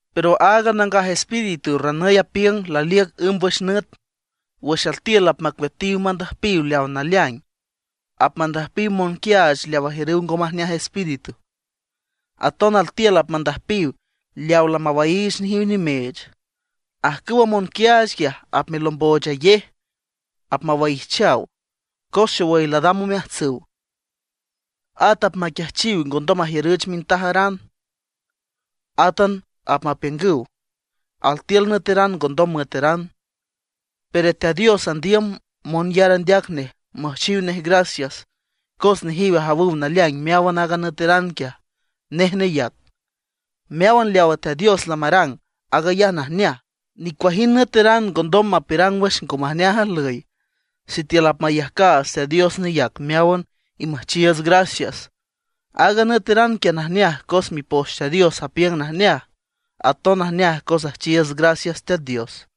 Pero aaga Nangaj Espíritu ranüy apiüng laliüc ǘmbwüx nüt, wüx altiül apmacueatiw mandüjpiw leawa naleaing, apmandüjpiw monquiaach leaw ajiürüw ngo majneaj espíritu, aton altiül apmandüjpiw leawa lamawaiich nejiw nimeech. Ajcüwa monquiaach quiaj apmelomboochayej, apmewaijchaw, cos xowüy ladam omeajtsüw. At apmaquiajchiw ngondom majiürüch mintajaran. Átan apmapiüngüw altiül nüeteran ngondom müeteran. Pero Teat Dios andiüm monyar andeac nej müjchiw nej gracias cos nejiw ajawüw naleaing meáwan aaga nüeteran quiaj nej neyac. Meáwan leawa Teat Dios lamarang, aag ayaj najneaj. Nicuajind nüeteran ngondom mapiürang wüx ngo majneaj ajlüy sitiül apmayajcaats Teat Dios neyac meáwan y müjchiiüts gracias. Aaga nüeteran quiaj najneaj cos Mipoch Teat Dios apiüng najneaj; aton najneaj cos üjchiiüts gracias Teat Dios.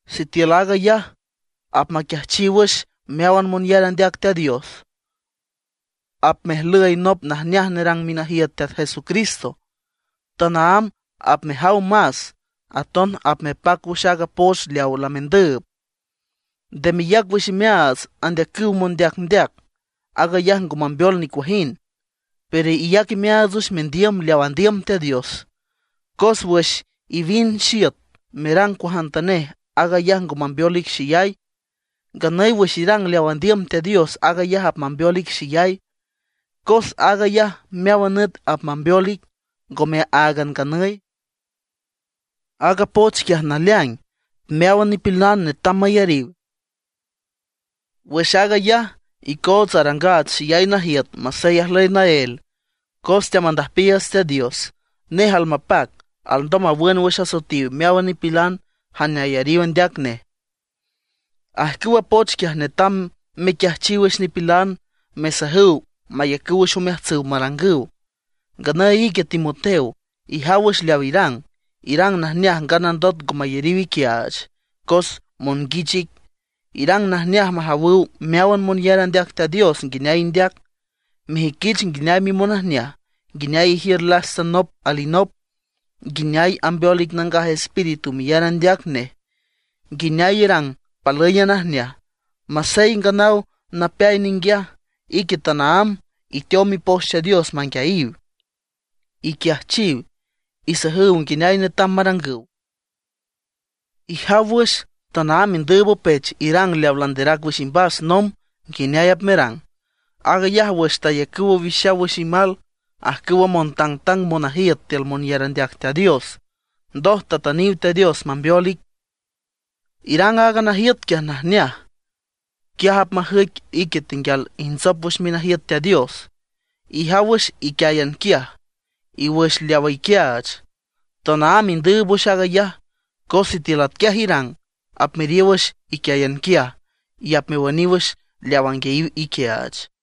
Sitiül aag ayaj apmequiajchiw wüx meáwan monyar andeac Teat Dios, apmejlüy nop najneaj nerang minajiüt Teat Jesucristo. Tanaámb apmejaw más, aton apmepac wüx aaga poch leawa lamendüüb. Nde meyac wüx imeaats andeacüw mondeacndeac; aag ayaj ngo mambeol nicuajind. Pero iyac imeaats wüx mendiüm leaw andiüm Teat Dios. Cos wüx iwind xiüt merang cuajantanej, aag ayaj ngo mambeol ic xeyay; nganüy wüx irang leaw andiüm Teat Dios aag ayaj apmambeol ic xeyay, cos aag ayaj meáwan nüt apmambeol ic, ngome áagan nganüy. Aaga poch quiaj naleaing, meáwan nipilan netam mayariw. Wüx aag ayaj icoots arangaats xeyay najiüt masey ajlüy naél, cos teamandüjpiiüts Teat Dios. Nej almapac, alndom mawün wüx asoetiw meáwan nipilan jane ayariw andeac nej. Ajcüwa poch quiaj netam mequiajchiw wüx nipilan, mesajüw mayacüw wüx omeajtsüw marangüw. Nganüy ique Timoteo, ijaw wüx leaw irang, irang najneaj nganandot ngo mayariw iquiaach cos monguich ic. Irang najneaj majawüw meáwan monyar andeac Teat Dios nguineay indeac, mejüiquich nguineay mimonajneaj, nguineay ijiür lasta nop alinop, nguineay ambeol ic Nangaj Espíritu meyar andeac nej, nguineay irang palǘyan najneaj. Masey nganaw napeay ninguiaj, ique tanaámb iteow Mipoch Teat Dios manguiayiw, iquiajchiw, isajüw nguineay netam marangüw. Ijaw wüx, tanaámb indüüb opech irang leawa landerac wüx imbas nomb nguineay apmerang. Aag ayaj wüx tayacüw owixaw wüx imal ajcüwa montangtang monajiüt tiül monyar andeac Teat Dios, ndoj tatüniw Teat Dios mambeol ic. Irang aaga najiüt quiaj najneaj, quiaj apmajüic ique tenguial ijntsop wüx minajiüt Teat Dios. Ijaw wüx iquiáyan quiaj, y wüx leawa iquiaach. Tanaámb indüüb wüx aag ayaj, cos sitiül atquiaj irang, apmeriow wüx iquiáyan quiaj, y apmewüniw wüx leawa anguiayiw iquiaach.